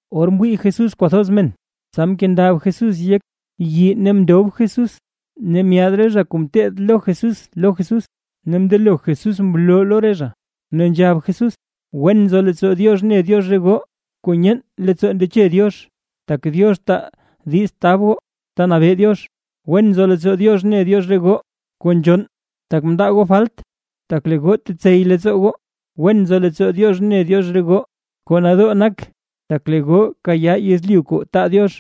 Or mwii Jesús kwathoz men, tsa mkendab Jesús yek yii ne mndob Jesús, ne myaad re zha kuu ngeteed lo Jesús lo Jesús, ne mndelo Jesús mloo lo re zha, ne nzhab Jesús: ―Wen nzo leettsoo Diox ne Diox re goo kuu nyeen leettsoo ndeche Diox, tak Diox taa diiz tab goo ta nabee Diox. ’Wen nzo leettsoo Diox ne Diox re goo kuu nzhonn, tak mndaa goo falt, tak lee goo tetsey leettsoo goo. ’Wen nzo leettsoo Diox ne Diox re goo kuu nadoo nak, tak lee goo kayaa yezlyu kuu taa Diox.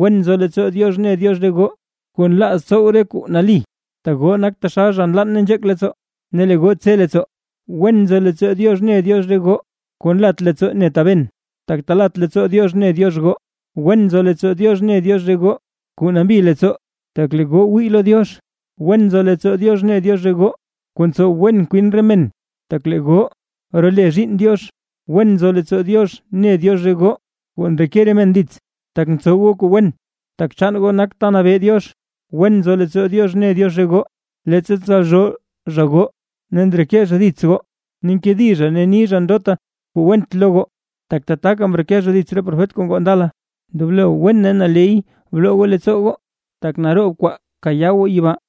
’Wen nzo leettsoo Diox ne Diox re goo kuu nlaaz tsow re kuu nali, tak goo nak taxal zha kuu nlann ne nzheek leettsoo, ne lee goo tse leettsoo. ’Wen nzo leettsoo Diox ne Diox re goo kuu nlat leettsoo ne taben, tak talat leettsoo Diox ne Diox goo. ’Wen nzo leettsoo Diox ne Diox re goo kuu nambi leettsoo, tak lee goo wii lo Diox. ’Wen nzo leettsoo Diox ne Diox re goo kuu ntsow wen kwin re men, tak lee goo role zhiinn Diox. ’Wen nzo leettsoo Diox ne Diox re goo kuu ndreke re men dits, tak ntsow goo kuu wen, tak chaan goo nak ta nabee Diox. ’Wen nzo leettsoo Diox ne Diox re goo, leettsa ntsalzhoo zha goo ne ndreke zha dits goo, ne nkedi zha ni zha ndota kuu went lo goo, tak tataka mreke zha dits re profet kuu ngoo ndala. Ndoblo wen ne naley bloo goo leettsoo goo, tak naroob re kwaa kayaa goo yibaa.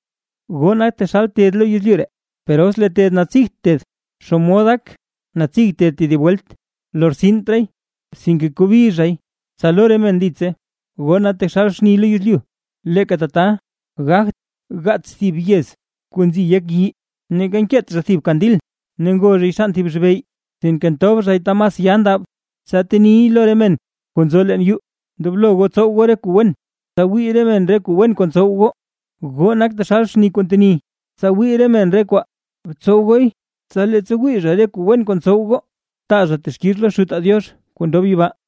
’Goo nak taxal ted lo yezlyu ree, per os lee ted natsigt ted, ¿xomod gak natsig ted tedib welt? Lortsint raay, sinke kobi zhay, tsa lo re men ditse. ’Goo nak taxal xni lo yezlyu. Leeka tata, gagt gaats thib yez kuu nzi yek yii. Ne neeka nkeet zha thib kandil, ne ngo zhay xann thib zhibey; sinke ntob zhay ta mas ya ndab, tsa teniy lo re men kuu nzo leen yuu. Ndoblo goo tsow goo re kuu wen, tsa wii re men re kuu wen kuu ntsow goo. Goo nak taxal xni kuu nteni, tsa wii re men re kwaa. Btsow gooy, tsa leettsa wii zha re kuu wen kuu tsow goo, taa zha texkix lo Xutaa Diox kuu ndob yibaa.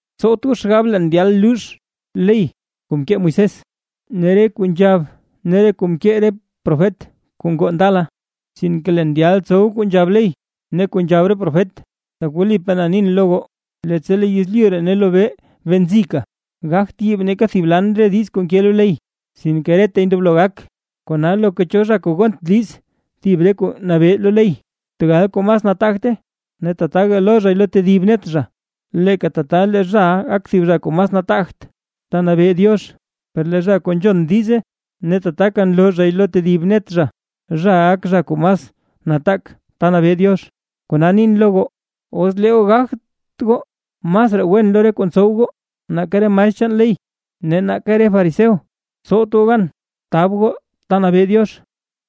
’Tsowt goo xgab leen ndyal luux ley kuu mkee Moisés, ne re kuu nzhab ne re kuu mkee re profet kuu ngoo ndala, sinke leen ndyal tsow kuu nzhab ley ne kuu nzhab re profet. Tak wlipaa na nin lo goo, leettsa lee yezlyu ree ne lee lobee bee nzika, gagt yiib neeka thib lan re diiz kuu nke lo ley, sinke reta ndoblo gak. Kona loka cho zha kuu gont diiz thib re kuu nabee lo ley, tegal kuu mas nataagte, ne tataga loo zhay lo tedib net zha, leeka tata lee zhaʼa gak zha kuu mas nataagt ta nabee Diox. Per lee zha kuu nzhon diize ne tataka loo zhay lo tedib net zha, zhaʼa gak zha kuu mas nataak ta nabee Diox. Kona nin lo goo, os lee goo gagt goo masraa wen lo re kuu ntsow goo, nake re maestr chaan ley ne nake re fariseo, tsowt goo gan tab goo ta nabee Diox.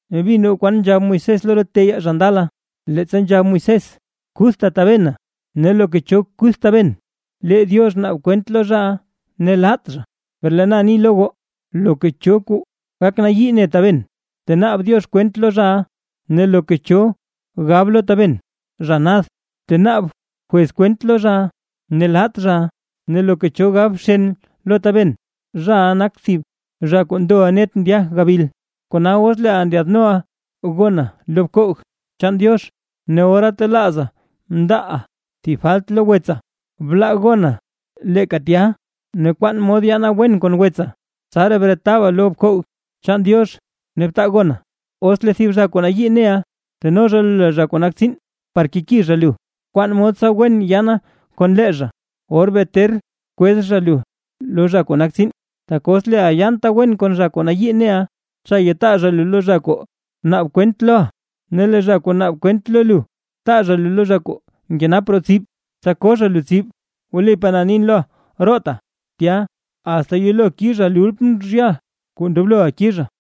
’Ne mbin goo kwan nzhab Moisés lo re teyaa zha ndala, leettsa nzhab Moisés: “Kuthta tabena, ne loka cho kuth taben, lee Diox naab kwent lo zhaʼa ne laat zha”. Per lee na ni lo goo, loka cho kuu gak nayii lo taben, tenaab Diox kwent lo zhaʼa, ne loka cho gab lo taben “zha nad”, tenaab jwez kwent lo zhaʼa ne laat zhaʼa, ne loka cho gab “bxen” lo taben, zhaʼa nak thib zha kuu ndoʼa net ndya gabil. ’Kona os leeʼa ndyaadnoʼa gona lo bkoog chaan Diox, ne ora telaaza mndaaʼa thib falt lo wetsa, blaa gona leeka tya, ne bkwaan mod yaana wen kon wetsa. Tsaraa bretaba lo bkoog chaan Diox ne btaa gona. ’Os lee thib zha kuu nayii neʼa, teno zha lu lo zha kuu nak tsiin par keki zha lu, kwaan mod tsa wen yaana kon lee zha, or bee ter kwez zha lu lo zha kuu nak tsiin, tak os leeʼa yaanta wen kon zha kuu nayii neʼa, cha yataa zha lu lo zha kuu naab kwent loʼa, ne lee zha kuu naab kwent lo lu taa zha lu lo zha kuu nkenap roo tsib, tsa ko zha lu tsib. Wlipaa na nin roota tya, asta yelo kizha lultm rehal kuu ndobloʼa kizha.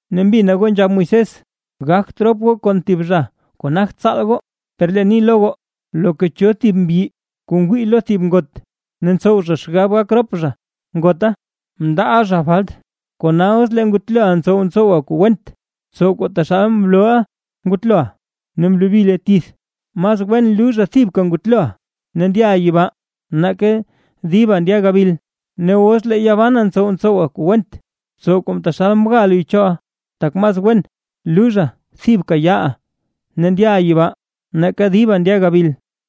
’Ne mbina goo nzhab Moisés: “Gagt rop goo kon thib zha kuu nagt tsaal goo”. Per leen ni lo goo, loka cho thib mbyi kuu ngwii lo thib ngot, ne ntsow zha xgab gak rop zha kon ngota, mndaaʼa zha falt. Kona os lee ngutloʼa ntsow ntsowa kuu went, btsow kuu taxal mlooʼa ngutloʼa ne mlobi luy tith, mas wen luuzha thib ngutloʼa ne ndyaʼa yibaa, nake diba ndya gabil. Ne os lee yaa bana ntsow ntsowa kuu went, btsow kuu taxal mga luy choʼa; tak mas wen luuzha thibka yaaʼa ne ndyaʼa yibaa, nake diba ndya gabil.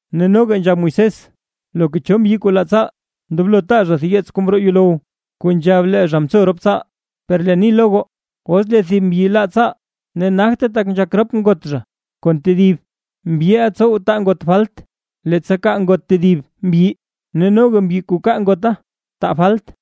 ’Ne noga nzhab Moisés: “Loka cho mbyi kuu laa tsaal, ndoblo taa zha thib yeets kuu mroo yuulow, kuu nzhab lee zha mtso rop tsaal”. Per leen ni lo goo, os lee thib mbyi laa tsaal, ne nagte tak ngok rop ngot zha kon tedib mbyi, mbyiʼa ntsow taa ngot falt, leettsa kaa ngot tedib mbyi, ne noga mbyi kuu kaa ngota taa falt.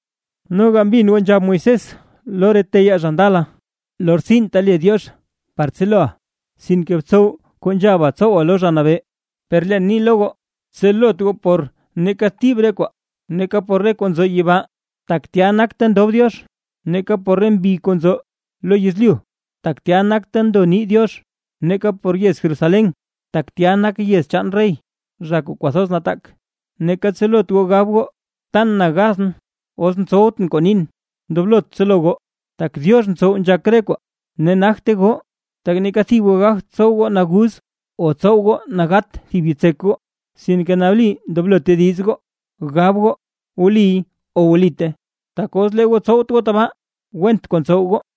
’Noga mbin goo nzhab Moisés lo re teyaa zha ndala: “Lortsinta le Diox par tseloʼa, sinke btsow kuu nzhaba tsowa lo Zha Nabee”. Per leen ni lo goo, tselot goo por neeka thib re kwaa, neeka por re zha kuu nzo yibaa, tak tya nak ta ndob Diox, neeka por re mbi kuu nzo lo yezlyu, tak tya nak ta ndo nii Diox; neeka por yez Jerusalén, tak tya nak yez chaan rey, zha kuu kwathoz nataak. Neeka tselot goo gab goo tan na gathʼn os tsowtʼn kuu nin. Ndoblot tselo goo, tak Diox ntsow nzhak re kwaa ne nagte goo, tak neeka thib goo gagt tsow naguz goo o tsow goo nagat goo thib yitsek goo. Sinke nali ndoblo tediz goo gab goo “wliy” o “wlite”. Tak os lee goo tsowt goo tabaa, went kuu ntsow goo.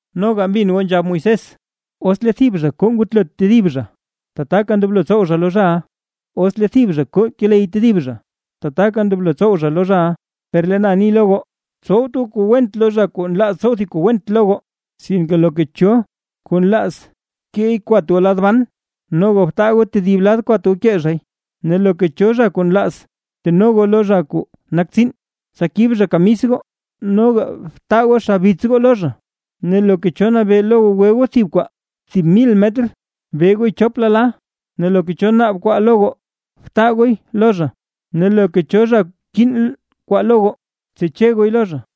’Noga mbin goo nzhab Moisés: “Os lee thib zha koo ngutlo tedib zha, tataka ndoblo tsow zha lo zhaʼa, ne os lee thib zha koo keley tedib zha, tataka ndoblo tsow zha lo zhaʼa”. Per leen ni lo goo: Tsowt goo kuu went lo zha kuu nlaaz tsow thib kuu went lo goo; sinke loka cho kuu nlaaz keey kwat goo lad ban, noga btaa goo tedib lad kwat goo kee zhay. Ne loka cho zha kuu nlaaz teno goo lo zha kuu nak tsiin, tsa kib zha kamis goo, noga btaa goo xabits goo lo zha. Ne loka cho kuu nabee lo goo gwe goo thib kwaa thib mil metr, be gooy chop lala. Ne loka cho naab kwaa lo goo, btaa gooy lo zha, ne loka cho zha kinn kwaa lo goo, btseche gooy lo zha.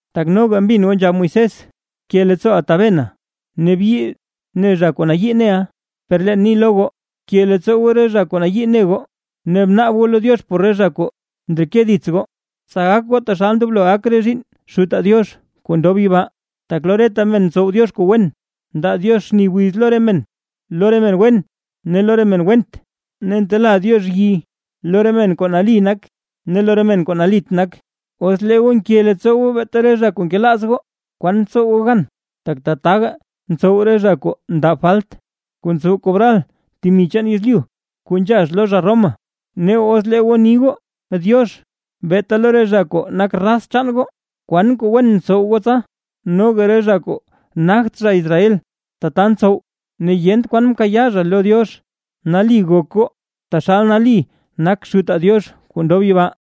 ’Tak noga mbin goo nzhab Moisés: “Bke leettsooʼa tabena, ne byii ne zha kuu nayii neʼa”. Per leen ni lo goo, bke leettsoo goo re zha kuu nayii ne goo, ne bnaab goo lo Diox por re zha kuu ndreke dits goo. Tsa gak goo taxal ndoblo gak re zhiinn Xutaa Diox kuu ndob yibaa; tak lo reta men ntsow Diox kuu wen, ndaa Diox xni wiz lo re men wen ne lo re men went, ne ntela Diox yi lo re men kuu nali nak ne lo re men kuu nalit nak. Os lee goo nke leettsoo goo beeta re zha kuu nkelaaz goo, ¿kwan tsow goo gan? Tak tataga ntsow re zha kuu ndab falt, kuu ntsow kobral temi chaan yezlyu kuu nzhax lo zha Roma. Ne os lee goo ni goo “diox”, beeta lo re zha kuu nak raz chaan goo. ¿Kwan kuu wen ntsow goo tsa? Noga re zha kuu nagt zha Israel tata ntsow, ne yent kwan kayaa zha lo Diox. Nali gok goo, taxal nali nak Xutaa Diox kuu ndob yibaa.